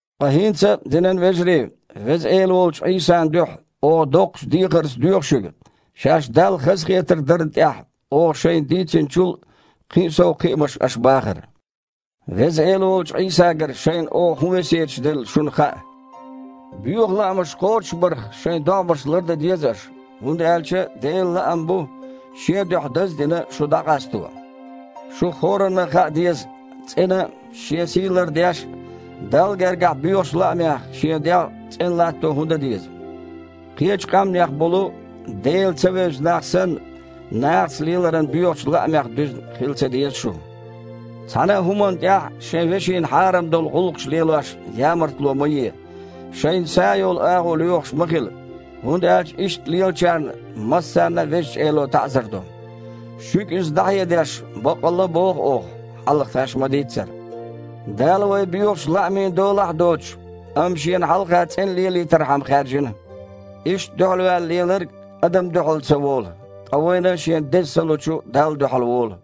Ткъа хІинца, динан вежарий, Веза Эла волчу Іийсан дуьхьа, оха доккхачу дехарца доьху шуьга шаьш Далла хазахетарг дарна тІехь оха шайга дийцинчул а, кхин а сов кхиамаш аш бахар. Веза Эла волчу Іийсагара шайна оха хІун весеташ делла, шуна хаьа. Боьха лаамаш кхочушбарх шайн догІмаш лардан деза аша, хІунда аьлча Делан лаам бу, Шен дуьхьа даз а дина, шу дІакъасто. Шух хІоранна а хаа деза, цІена а, шен сий лардеш а, Далла гергахь боьхачу лаамех шен дегІ цІена латто хІун дан деза. Кхечу къаьмнех болу, Дела ца вевза нах санна, нахаца леларан боьхачу лаамех дуьзна хила ца деза шу. Цхьана а хІуманна тІехь шайн вешина хьарам долу гІуллакхаш лелош ямартло ма е, шайна са йолу агІо лоьхуш ма хила, хІунда аьлча иштта лелачарна массарна а Везачу Эло таІзар до. Шуьга иза дІахьедеш баккъалла а боху оха, хьалха тхаьш ма-дийццара. Дала вай боьхачу лаамийн долахь а доцуш, амма Шена хьалха цІена лелийтархьама хаьржина. Иштта дуьхьалваьлла леларг адамна дуьхьал ца волу, ткъа вайна Шен Деза Са лучу Далла дуьхьал волу.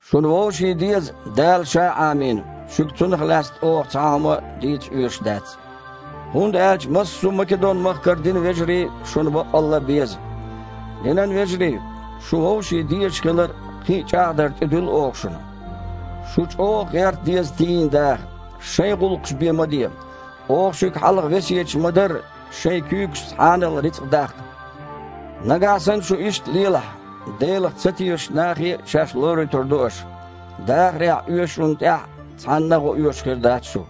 Шуна вовшийн деза Дала Ша Іамийна, шуьга цунах лаьцна оха цхьа а хІума дийца оьшуш дац. ХІунда аьлча массо а Македон-махкара динан вежарий шуна баккъалла беза. Динан вежарий, шун вовшийн дезаш хилар кхин а чІагІдар тІедуьллу оха шуна. Шу чІогІа гІерта деза тийна даха. Шайн гІуллакхаш а бен ма де. Оха шуьга хьалха весеташ ма-дарра, шайн куьйгашца хьанал рицкъа даккха. Нагахь санна шу иштта лелахь, Делах ца тешачу нахе а шаьш лоруьйтур ду аша, дахарехь оьшучунна тІехь а цхьаннан а гІо оьшуш а хир дац шу.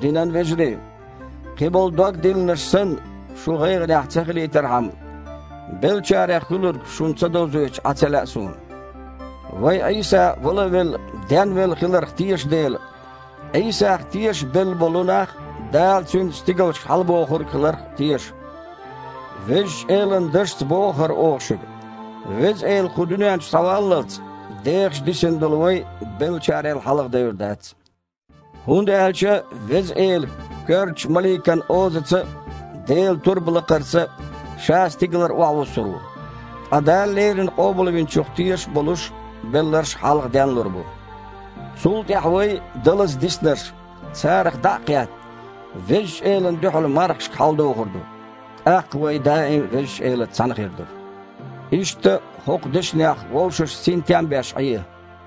Динан вежарий, кхин болу дог диллинарш санна, шу гІайгІанехь ца хилийтархьама, беллачарех хуьлург шуна ца довзуьйтуш Іа ца лаьа суна. Вай Іийса, вала а велла, денвелла хиларх теша дела, Іийсах тешаш белла болу нах а Дала Цуьнца стигалшка хьалабохург хиларх а теша. Везачу Элан дашца боху хІара оха шуьга, Веза Эла кху дуьнен чу схьаваллалц, дехаш дисина долу вай, беллачарел хьалха девр дац. ХІунда аьлча Веза Эла коьртачу маликан озаца а, Делан турба лакхарца а, Ша стигалара охьавуссур ву, ткъа Дала леррина Къобалвинчух тешаш а болуш белларш хьалха денлур бу. Цул тІаьхьа вай, далаза диснарш, царах дІа а кхетта, Везачу Элана дуьхьал мархашка хьаладохур ду. ТІаккха вай даим Везачу Элаца цхьаьна хир ду. Иштта, хІокху дешнех вовшашна синтем а беш Іе.